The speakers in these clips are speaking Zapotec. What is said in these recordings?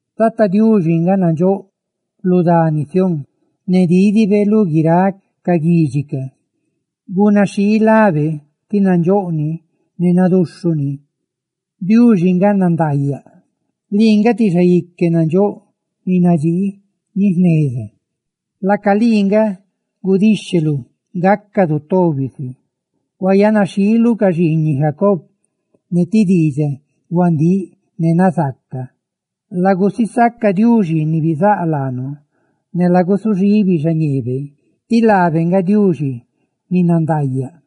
Tata Diuxi nga nandxóꞌ lu dani Sión; ne dídibe lú guiráꞌ ca guidxi ca. Guidunaxhii lábe, tí nandxóꞌ ni ne naduxhuꞌ ni; ¡Diuxi nga nandaayaꞌ! Lii nga ti Xaique nandxóꞌ ni nadxii ni jneza; laaca lii nga gudíxheluꞌ gácadu tobi si. Huayanaxhiiluꞌ ca xiiñiꞌ Jacob ne ti diidxaꞌ huandíꞌ ne nazaaca. ¡Lagusisaca Tata Diuxi, Diuxi ni bizáꞌ laanu, ne lagusuxibi xañeebe! ¡Diuxi nga nandaayaꞌ!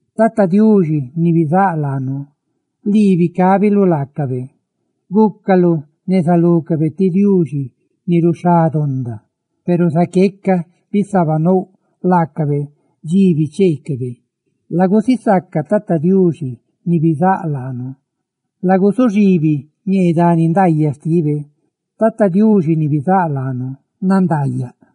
Tata Diuxi, Diuxi ni bizáꞌ laadu, ¡lii bicábiluꞌ laacabe! Gúcaluꞌ neza lúcabe ti Diuxi ni ruxhá donda, peru zaqueca bisabanouꞌ laacabe dxi bicheecabe. Lagusisaca Tata Diuxi, Diuxi ni bizáꞌ laanu, ¡laguzuxibi ñee dani nandaayaꞌ xtibe! ¡Tata Diuxi, Diuxi ni bizáꞌ laanu, nandaayaꞌ!